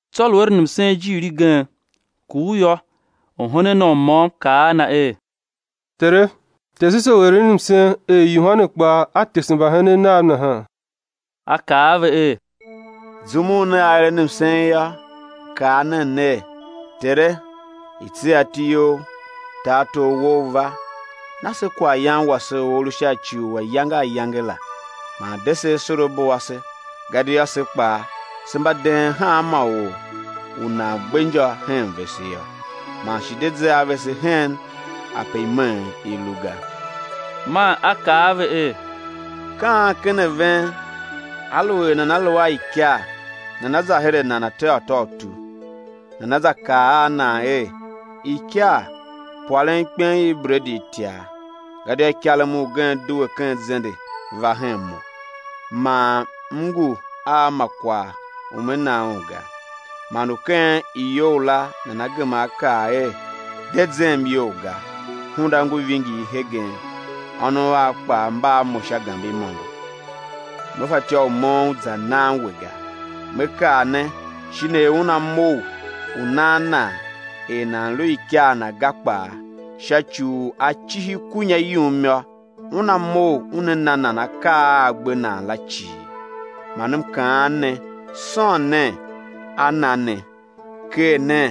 Tsô lu eren msen ijiir igen, kur yô, orhenen Na u môm kaa a Na er: Tere, tese se u eren msen, er Yohane kpaa a tese mbahenen nav nahan. A kaa a ve er: Zum u nea eren msen yô, kaa nen ner: Tere, i̱ tsegha iti You; tartor Wou u̱ va. Na se kwaghyan wase u a lu sha ci u ayange ayange la; man de se asorabo ase, gadia se kpaa, se mba deen hanma or u nan gbe injô hen vese yô. Man shi de ze a vese hen ape imeen i lu ga. Man A kaa a ve er: Ka an ken a ven, aluer nana lu a ikar nana za her a nan ateghôtôutu, nana za kaa a na er: Ikar, pwarem ikpen i bredi itiar, gadia ikarem ugen due ken zende, va hen mo, man m ngu a ma kwagh u me na un ga; man u ken iyou la nana gema á kaa er: De zem iyol ga, hunda ngu vingir hegen, ônov av kpaa mba a mo sha gambe imôngo, me fatyô u moughon za nan we ga. Me kaa ne shin er una mough u nan nan er nan lu ikar na ga kpaa, sha ci u a cihi kunya yum yô, una mough una na nan akaa a a gbe nan la cii. Man M kaan ne: Sôn nen, á na ne; ker nen,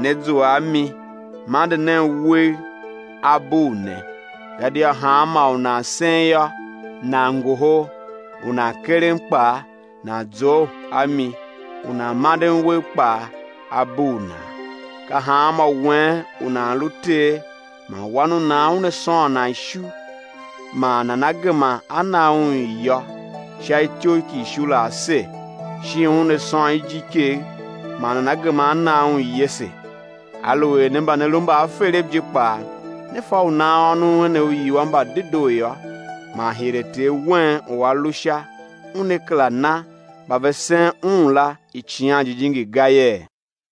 né zua a mi; mande nen uwegh, á bugh ne. Gadia hanmô u nan sen yô, nan ngohol; u nan keren kpaa, nan zough a mi u nan manden wegh kpaa á bugh nan. Ka hanmô wen u nan lu ter man wan u nan una sôn nan ishu, man nana gema á na un iyô sha ityough ki ishu la ase? Shin una sôn ijikegh, man nana gema á na un iyese? Aluer ne mba ne lu mbaaferev je kpaa ne fa u nan ônov enev uiwua mba dedoo yô, man hire Ter wen u A lu Sha Una kera na mba ve sen Un la Icighan Jijingi ga yee?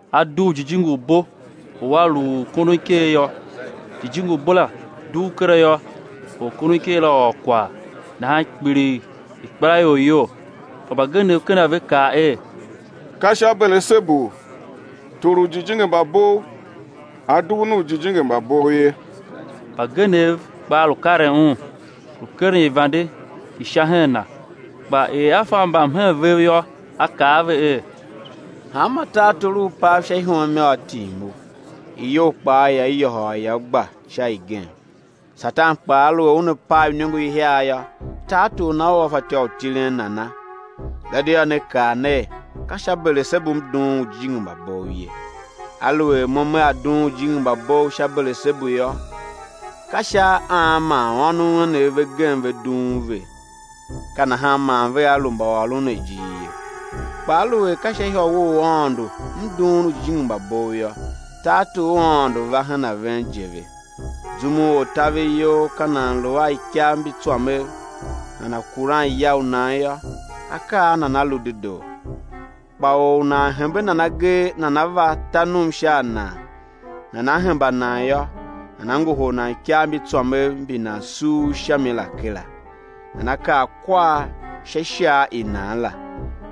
A dugh jijingi u bo u a lu u kondon iker yô. Jijingi u bo la dugh kera yô, orkondoniker la ôr kwagh; nahan kpiligh ikpelaior iyol. Kpa mbagenev ken a ve kaa er: Ka sha Belesebu, tor u ujijingi mba bov, A dughun ujijingi mba bov ye. Mbagenev kpaa lu karen Un, lu keren ivande i Sha hen Na. Kpa er A fa mbamhen vev yô, A kaa a ve er: Hanma tartor u u pav sha ihom yô, á tim u, iyou kpaa ia yôhôl, ia gba sha igen. Satan kpaa aluer una pav iniongo ihiar yô, tartor na ua fatyô u tilen nana? Gadia ne kaa ner, ka sha Belesebu M dughun ujijingi mba bov ye. Aluer Mo Mea dughun ujijingi mba bov sha Belesebu yô, ka sha an man ônov enev ve gem ve dughun ve? Ka nahan man vea lu mbaôron ne ijir ye. Kpa aluer ka sha ihôwe u Aôndo M dughun ujijingi mba bov yô, tartor u Aôndo va hen a ven je ve. Zum u ortaveryol ka nan lu a ikav mbi tswamev, nana kuran ya u nan yô, akaa a nan a lu dedoo. Kpa or u nan hembe nan agee, nana va ta num sha a nan, nana hemba nan yô, nana ngohol nan ikav mbi tswamev mbi nan suur sha mi la kera, nana kar kwar sha ishar i nan la.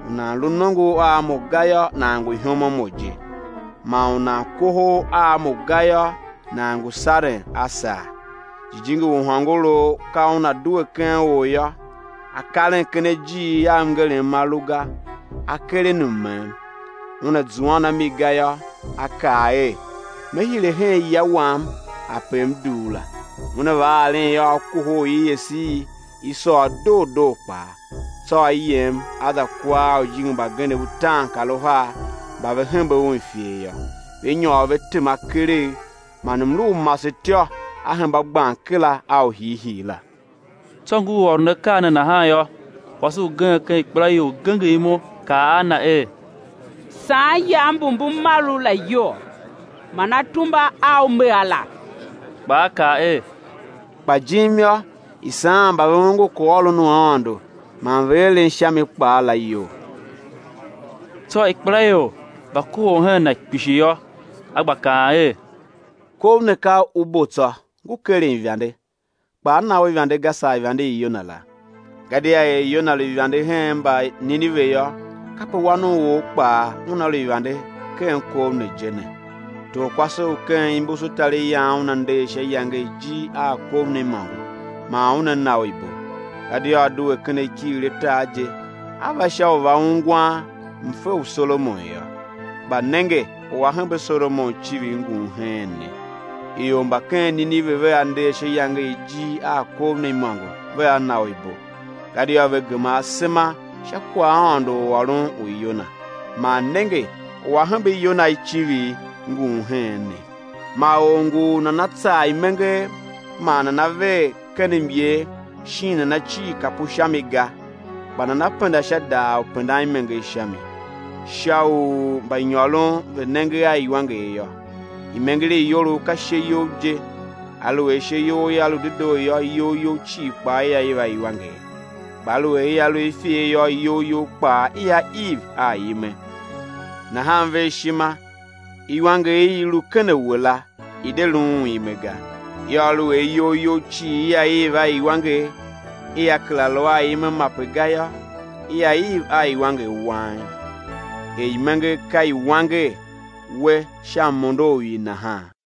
U nan lu nongo a Mo ga yô, nan ngu ihom a Mo je; man u nan kohol a Mo ga yô, nan ngu saren a sar. Jijingi u hôngorough ka una due ken or yô, a karen sha ajiir a mngerem ma lu ga, a keren mmem; una zuan a mi ga yô, a kaa er: Me hire hen ya wam ape m dugh la. Una va aren yô, a kohol un, i ese, i sôr doo doo kpaa. Tsô a yem a za kua a ujijingi mbagenev utaankaruhar mba ve hembe un ifer yô, ve nyôr ve tema keregh man mlu u masetyô a hemba gban kera a u hiihii la. Tsô ngur ôron akaa ne nahan yô, kwase ugen ken ikpelaior genger imo, kaa a Na er: Saan iyav mbu mbu mar U la iyol, man atumba a U me a la. Kpa A kaa er: Kpa jim yô, i saan mba ve ongo kwaghôron u Aôndo man ve eren sha mi kpaa la, iyol. Tsô ikpelaior va kohol hen Na kpishi yô, A gba kaan er: Kov ne ka u bo tsô, ngu keren ivande; kpa á na u ivande ga, saa ivande i Yona la. Gadia er Yona lu ivande hen Mbanineve yô, kape Wan u or kpaa Una lu ivande hen kov ne je ne. Torkwase u ken imbusutariyan una nder sha iyange i ijir a kov ne imôngo, man una na u ibo, gadia a due ken akighir a tar je, a va sha u va ungwan mfe u Solomon yô; kpa nenge, u A hembe Solomon icivir, ngun heen ne! Ior mba ken Nineve vea nder sha iyange i ijir a kov ne imôngo vea na u ibo; gadia ve gema asema sha kwaghaôndo u ôron u Yona; man nenge, u a hembe Yona icivir, ngun heen ne. Ma or ngu u nana tsar imenger man nana ver ken myer, shin nana cir kapu sha mi ga, kpa nana penda sha daar u pendan imenger sha mi, sha u mbanyôron ve̱ nenge a iwanger yô. Imenger i iyolough ka ishe you je. Aluer ishe you ia lu dedoo yô, iyol you cii kpaa ia iv a iwanger; kpa aluer ia lu i ifer yô, iyol you kpaa ia iv a ime. Nahan ver ishima, iwanger i i lu ken a we la, i̱ de luun ime ga. Yô, aluer iyol you cii ia iv a iwanger ia kera lu a ime mape ga yô, ia iv a iwanger wang, er imenger ka i wanger we sha mondo u i nahan.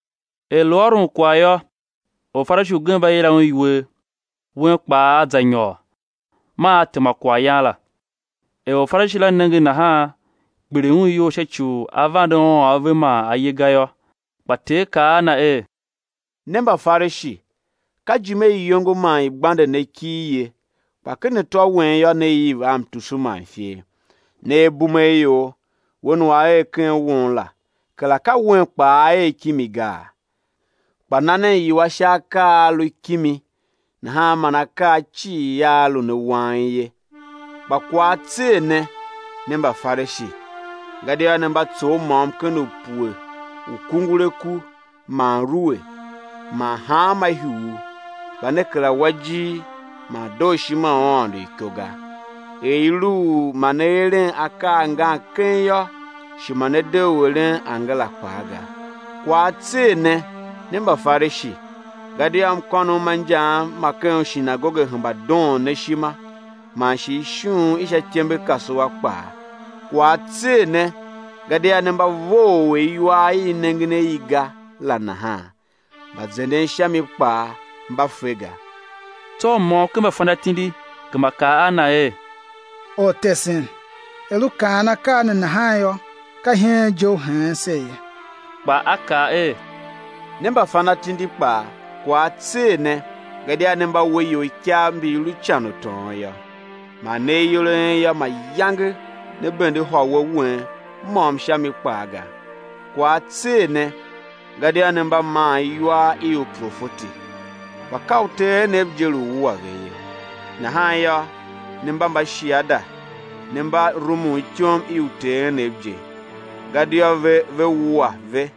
Er lu ôron kwagh yô, Orfarishi ugen va yila Un iwer. Un kpaa A za nyôr, man A tema kwaghyan la. Er Orfarishi la nenge nahan, kpiligh un iyol sha ci u A vande ôôn ave man A ye ga yô. Kpa Ter kaa a na er: Ne, Mbafarishi! Ka ijime i iyongo man i gbande ne kir ye, kpa ken atô wen yô, ne iv a mtusu man ifer. Ne abumeaior, Wen u A er ken won la, kera ka Wen kpaa A er kimi gaa? Kpa na nen iwua sha akaa a lu kimi; nahan man akaa cii aa lu ne wang ye. Kpa kwagh á tser ne! Ne Mbafarishi, gadia ne mba tsough môm-ken-upue u kunguraku man rue man hanma ihuugh, kpa ne kera wa ijir man dooshima u Aôndo iko ga. Er i lu u ma ne eren akaa angan keng yô, shi ma ne de u eren angara kpaa ga. Kwagh á tser ne! ne Mbafarishi, gadia mkônom ma injaam ma ken ushinagoge hemba doon ne ishima, man shi ishughun i sha ityembekasua kpaa. Kwagh á tser ne! gadia ne mba vough er iwar i i nengen a i ga la nahan, mba zenden sha mi kpaa mba fe ga. Tsô u môm ken mbafanatindi gema kaa a Na er: Ortesen, er U kaan akaa ne nahan yô, ka iheen je U heen se ye. Kpa A kaa er: Ne mbafanatindi kpaa, kwagh á tser ne gadia ne mba we ior ikav mbi mbi lu ican u tôôn yô; man ne ayol a en yô, mayange ne bende ihôwe wen môm sha mi kpaa ga. Kwagh á tser ne! gadia ne mba maan iwar i uprofeti, kpa ka uter enev je lu wua ve ye. Nahan yô, ne mba mbashiada ne mba rumun ityom i uter enev je; gadia ve, ve wua ve;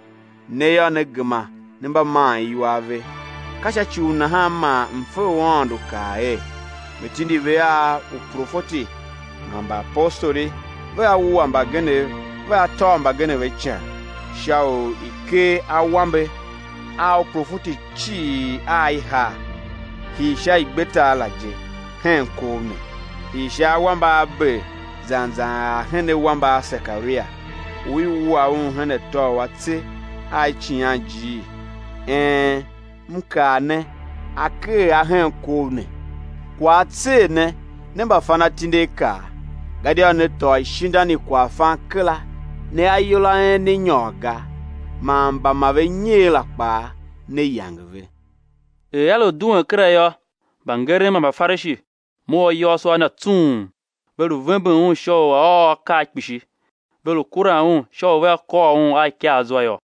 ne yô, ne gema ne mba maan iwar ve. Ka sha ci u nahan man mfe u Aôndo kaa er: Me tindi ve a uprofeti man mbaapostoli; vea wua mbagenev, vea tôv mbagenev a ican; sha u i ker awambe a uprofeti cii a i haa, hii sha igbetar la je, hen kov ne; hii sha awambe a Abel zan zan ar hen awambe a Sekaria, u i wua un hen atô u atse a Icighanjiir, een, M kaa ne, á ker a hen kov ne. Kwagh á tser ne, ne mbafanatindiakaa, gadia ne tôô ishindan i kwaghfan kera; ne ayol a en ne nyôr ga man mba ma ve nyer la kpaa ne yange ve. Er A lu duen kera yô, mbangeren man Mbafarishi mough ayôôso a Na tsung, ve lu vemben Un sha u A̱ ôr akaa kpishi, ve lu kuran Un sha u vea kôr Un a ikaa zwa yô.